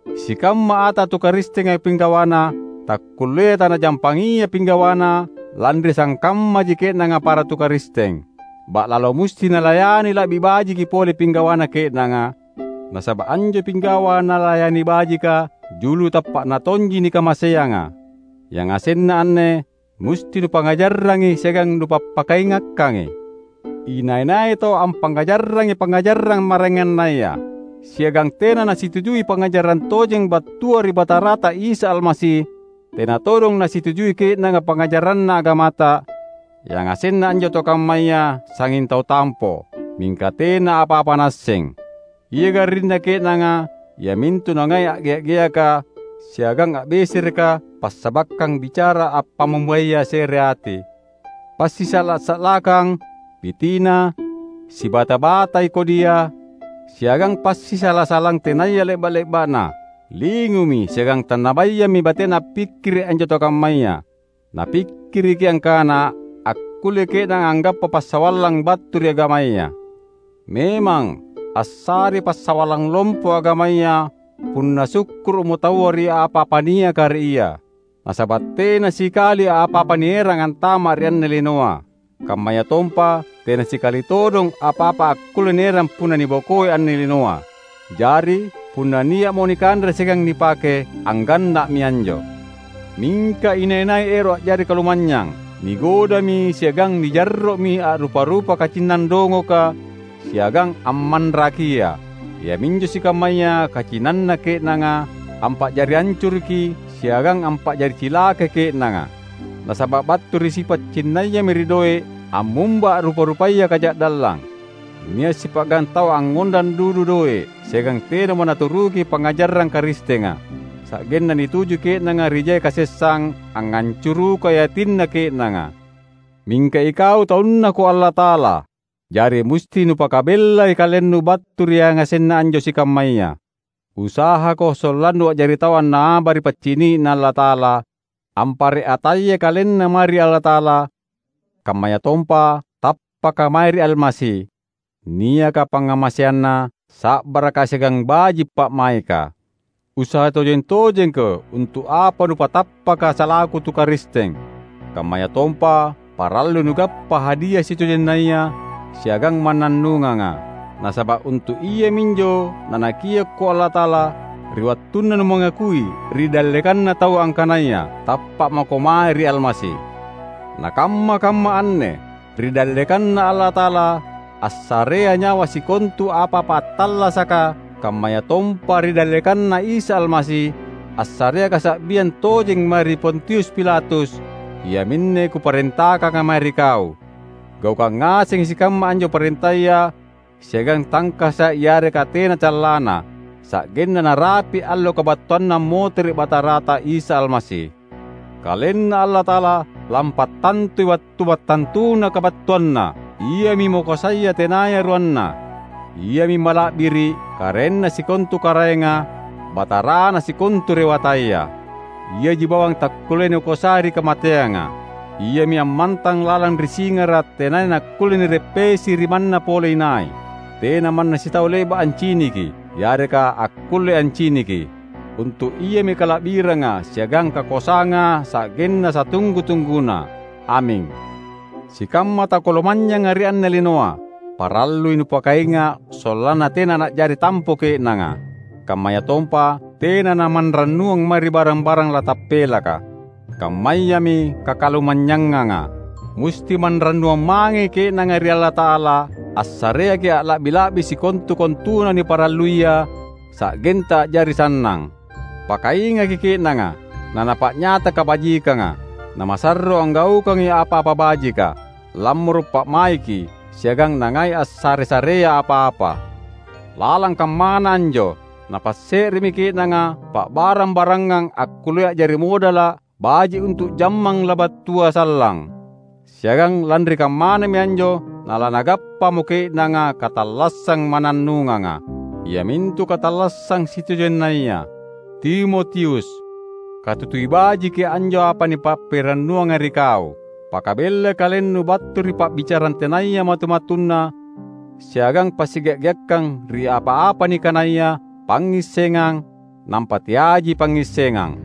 Sikamma ata tu Karistenga pinggawana, takkulleai tanajampangia pinggawana lanri sangkammaji ke’nanga para tu Karisteng. Ba’lalo musti nalayani la’bi bajiki pole pinggawana ke’nanga, nasaba’ anjo pinggawa nalayani bajika julu tappa’na tonji nikamaseanga. Yangasenna anne musti nupangngajarrangi siagang nupappakaingakkangi. Inai-nai tau ampangngajarrangi pangngajarang maraengannaya, siagang tena nasitujui pangngajarang tojeng battua ri Batarata Isa Almasi tena todong nasitujui ke’nanga pangngajaranna agamata, yangasenna anjo tau kammaya sangnging tau tampo, mingka tena apa-apa naasseng! Ia garrinna ke’nanga iamintu nangai a’gea’-geaka siagang a’besereka passabakkang bicara appamumbaya sereati, passisa’la-sa’lakkang, pitina, sibata-batai kodia, siagang passisala-salang tenaya le’ba’-le’ba’na. Lingumi siagang tannabayami batena appikkiri’ anjo tau kammaya. Napikkiriki angkana akkullei ke’nanga anggappa passawallang battu ri agamaya. Memang assarei passawallang lompo agamaya punna sukkuru’mo taua ri apa-apa niaka ri ia. Nasaba’ tena sikali apa-apa nierang antama’ ri anne linoa. Kammayatompa tena sikali todong apa-apa akkulle nierang punna nibokoi anne linoa! Jari, punna nia’mo nikanre siagang nipake, angganna’mi anjo. Mingka inai-nai ero’ a’jari kalumanynyang, nigodami siagang nijarro’mi ri a’rupa-rupa kacinnang dongoka siagang ammanrakia. Iaminjo sikammaya kacinnanna ke’nanga ampa’jari ancuruki siagang ampa’jari cilakai ke’nanga. Nasaba’ battu ri sipa’ cinnayami ri doe’ ammumba a’rupa-rupaya kaja’dallang. Nia’ sipa’gang tau angngondang dudu doe’ siagang tenamo naturuki pangngajarang Karistenga, sa’genna nituju ke’nanga ri jai kasessang angngancurukai atinna ke’nanga. Mingka ikau taunNako Allata’ala; jari musti nupakabellai kalennu battu ri yangasenna anjo sikammaya. Usahako sollannu a’jari tau annaba ri paccini’Na Allata’ala, ampare’ atayai kalenna mae ri Allata’ala; kammayatompa tappaka mae ri Almasi, niaka pangngamaseanna, sa’baraka siagang baji’ pa’maika. Usaha tojeng-tojengko untu’ apa nupatappaka salaku tu Karisteng, kammayatompa parallui nugappa hadia sitojennaya siagang mannannunganga. Nasaba’ untu’ iaminjo Nanakiokko Allata’ala ri wattunna numangakui ri dallekanna taua angkanaya tappa’ mako mae ri Almasi. Na kamma-kamma anne, ri dallekanNa Allata’ala assarea nyawa sikontu apa-apa attallasaka kammayatompa ri dallekanNa Isa Almasi assarea kasa’biang tojeng mae ri Pontius Pilatus, iaminne kuparentakanga mae ri kau: Gaukang ngasengi sikamma anjo parentaya siagang tangkasa’ yareka tena callanna, sa’genna narapi’ allo kabattuanNa ammotere’ Batarata Isa Almasi. KalenNa Allata’ala lampattantui wattu mattantuna kabattuanNa. Iami Makoasaya tenaya ruanna; Iami mala’biri’, Karaenna sikontu karaenga, Batarana sikontu rewataya. Iaji bawang takkullea nikoasai ri kamateanga; Iami ammantang lalang ri singara’ tenaya nakkulle nireppesi ri manna pole inai. Tena manna sitau le’ba’ anciniki, yareka akkulle anciniki. Untu’ Iami kala’biranga siagang kakoasanga sa’genna satunggu-tungguna! Aming! Sikamma tau kalumanynyanga ri anne linoa, parallui nupakainga’ sollanna tena na’jari tampo ke’nanga. Kammayatompa tena namanrannuang mae ri barang-barang latappelaka, kammayami kakalumanynyanganga. Musti manrannuang mangei ke’nanga ri Allata’ala assareaki’ alla’bi-la’bi sikontu-kontuna niparalluia, sa’genta a’jari sannang. Pakaingaki ke’nanga nanapa’nyata kabajikanga, namasarro anggaukangi apa-apa bajika, lammoro’ pa’maiki siagang nangai assare-sarea apa-apa. Lalang kammana anjo, napasse’remi ke’nanga pa’barang-barangang akkullea a’jari modala’ baji’ untu’ jammang labattua sallang. Siagang lanri kammanami anjo nalanagappamo ke’nanga katallassang mannannunganga, iamintu katallassang sitojennaya. Timotius! Katutui bajiki anjo apa nipappirannuanga ri kau! Pakabellai kalennu battu ri pa’bicarang tenaya matu-matunna siagang passigea’-geakkang ri apa-apa nikanaya "Pangngissengang," nampa teaiji pangngissengang.